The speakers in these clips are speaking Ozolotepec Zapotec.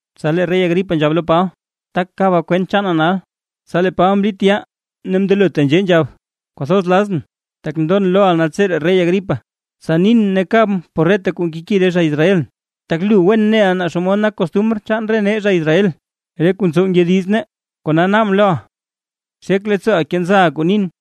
Tsa lee rey Agripa nzhab lo Paba: ―Tak kaba kwent chaana nal. Tsa lee Paba mlit yaa ne mndelo tenzhee nzhab: ―Kwathoz lazʼn tak ndon loʼa naltseree rey Agripa, tsa nin ne kabʼn por reta kuu nkeki re zha Israelʼn, tak wen neʼa naa xomod nak costumr chaan re nee zha Israel, re kuu ntsow ngyodiz nee, kona naabʼn loʼa xek leettsooʼa kenza kuu nin.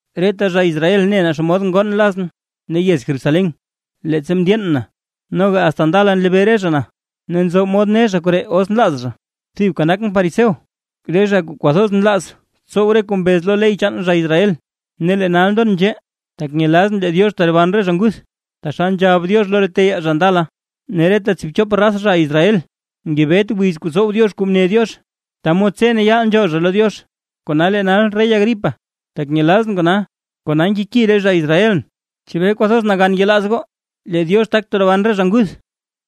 ’Reta zha Israel ne naa xomod ngoon lazʼn ne yez Jerusalén leettsa mndyeen na. Noga asta ndala nlebee re zha na, ne nzo mod ne zha koree os nlaaz zha, thibka nakʼn fariseo, re zha kuu kwathoz nlaaz tsow kuu mbez lo ley chaan re zha Israel. Ne lee nal ndon nzhee, tak nyelazʼn lee Diox teroban re zha nguth taxal nzhab Diox lo re teyaa zha ndala. Ne reta tsiibchop raz zha Israel ngebet wiz kuu tsow Diox kuu mne Diox, ta mod tse ne yaal nzhool zha lo Diox. Kona lee nal rey Agripa, tak nyelazʼn kona, kona nkeki re zha Israelʼn. ¿Chebee kwathoz nagan yelaaz goo lee Diox tak teroban re zha nguth?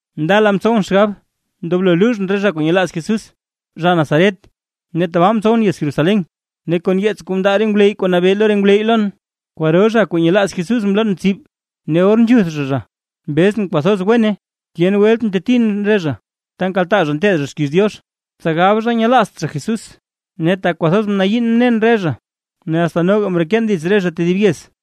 ’Ndala mtsowʼn xgab ndoblo luuzhʼn re zha kuu nyelaaz Jesús, zha Nazaret, ne tabaa mtsowʼn yez Jerusalén. Ne kon yeets kuu mndaa re ngwleyy kuu nabee lo re ngwleyy lon, kwaro zha kuu nyelaaz Jesús mloon tsib, ne or nzhuth zha zha mbezʼn kwathoz wene. Tyen welt mtetin re zha ta nkaltaa re zha nteed zha xkiiz Diox, tsa gab zha nyelaazt zha Jesús. Ne tak kwathoz mnayiin mnen re zha, asta noga mreken dits re zha tedib yez.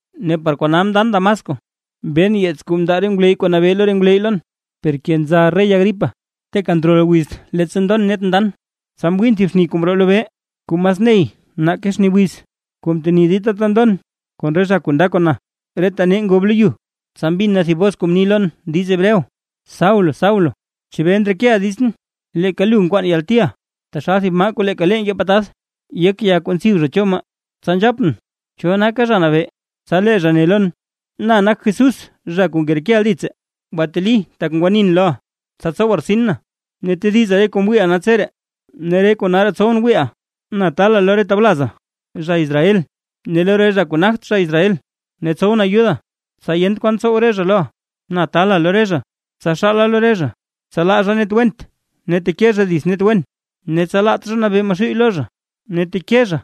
’Ne par kona ndan Damasco mben yeets kuu mndaa re ngwleyy kuu nabee lo re ngwleyy lon. Per kenza rey Agripa, teeka ndrol wiz, leettsa ndon net ndan, tsa mwiin thib xni kuu mroo lobee kuu mas ney nake xni wiz, kuu mteni dita ta ndon kon re zha kuu nda kon na. Reta nee ngob lo yu, tsa mbin na thib bos kuu mni lon diiz Hebreo: “Saulo Saulo, ¿chebee ndrekeʼa ditsʼn? Leeka lu nkwaana yaltiʼa, taxal thib maa kuu leeka lee nkee patad yek ya kuu ntsib zha cho maa.” Tsa nzhapʼn: ¿“Cho naka Zha Nabee”? Tsa lee zha ne lon: “Na nak Jesús zha kuu ngerekeʼa dits. Gwateli tak ngwanin loʼa, tsa tsowa rtsin na, ne tediza re kuu mwiiʼa naltseree ne re kuu nalraa tsowʼn wiiʼa. Na taala lo re tawlaza zha Israel ne lo re zha kuu nagt zha Israel, ne tsowʼn ayuda, tsa yent kwaan tsow re zha loʼa. Na taala lo re zha, tsa xaala lo re zha, tsa laa zha net went ne teke zha dits net wen, ne tsa laat zha nabee Maxuuy lo zha, ne teke zha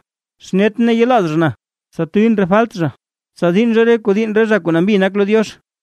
xnetʼn ne yelaaz zha na, tsa tuuyʼn re falt zha, tsa diinn zha re kuu diinn re zha kuu nambi nak lo Diox.”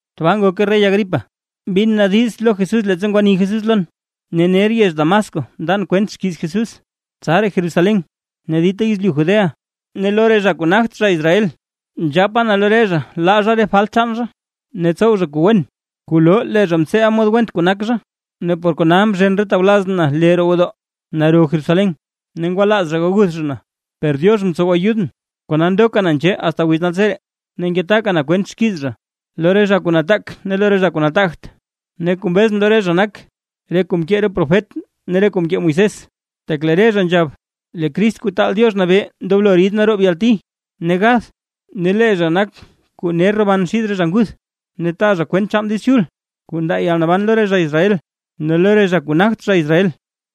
’Tbaa ngoke rey Agripa, mbin na diiz lo Jesús leettsa ngwani Jesús lon. Ne ner yez Damasco mndan kwent xkiiz Jesús, tsaraa Jerusalén ne dita yezlyu Judea ne lo re zha kuu nagt zha Israel. Nzhapa na lo re zha laa zha re falt chaan zha, ne tsow zha kuu wen kuu loo lee zha mtseeʼa mod went kuu nak zha. Ne por kona mzhen re tawlazʼn na lee roo gwodoo naro Jerusalén, ne ngwalaaz zha gaguth zha na. Per Diox mtsow ayudʼn kona ndoka na nzhee asta wiz naltseree, ne ngetaka na kwent xkiiz zha, lo re zha kuu nataak ne lo re zha kuu nataagt, ne kuu mbezʼn lo re zha nak re kuu mkee re profet ne re kuu mkee Moisés. Tak lee re zha nzhab: “Lee Crist Kuu Taal Diox Nabee ndoblo rid naroob yalti ne gath; ne lee zha nak kuu ner roban xid re zha nguth, ne taa zha kwent chaan Diiz Chul kuu ndaa yalnaban lo re zha Israel ne lo re zha kuu nagt zha Israel”.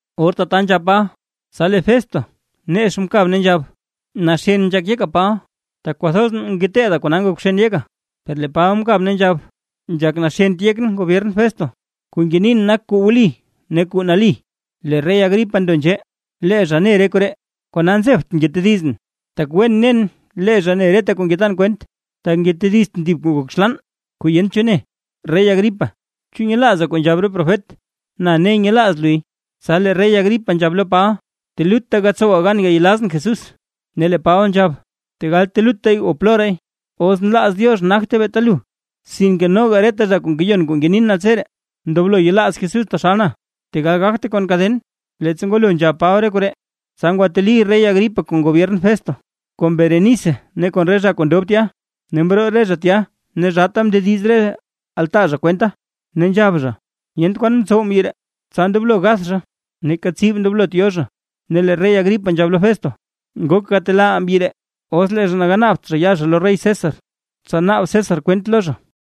Or tata nzhab Paba: Tsa lee Festo nex mkab ne nzhab: ―¡Naxen nzhak yeka Paba! Tak kwathoz ngeteeda kona ngok bxen yeka. Per lee Paba mkab ne nzhab: ―Nzhak naxent yekʼn gobyern Festo, kuu ngenin nak kuu wli ne kuu nali. Lee rey Agripa ndo nzhee, lee zha ne re koree, kona nzebtʼn ngetedizʼn, tak wen nen lee zha ne reta kuu ngetan kwent, tak ngetediztʼn thib kuu ngok xlaan, kuu yent cho ne. Rey Agripa ¿Chu nyelaaza kuu nzhab re profet? Na ne nyelaaz luy. Tsa lee rey Agripa nzhab lo Paba: ―Telutta gatsowa gan gayelazʼn Jesús. Ne lee Paba nzhab: ―Tegal teluttay o ploraay, os nlaaz Diox nagte beeta lu, sinke noga reta zha kuu ngeyon kuu ngenin naltseree, ndoblo yelaaz Jesús taxal na, tegal gagte kon kaden. Leettsa ngwalo nzhab Paba re koree, tsa ngwateli rey Agripa kon gobyern Festo ne kon Berenice ne kon re zha kuu ndob tya, ne mroo re zha tya ne zhaata mndediz re altaa zha kwenta, ne nzhab zha: ―Yent kwan mtsow mbyi ree, tsa ndoblo gath zha, neeka tsib ndoblot yo zha. Ne lee rey Agripa nzhab lo Festo: ―Ngok gatelaaʼaa mbyi ree, os lee zha ganaabt zha ya zha lo rey César, tsa naab César kwent lo zha.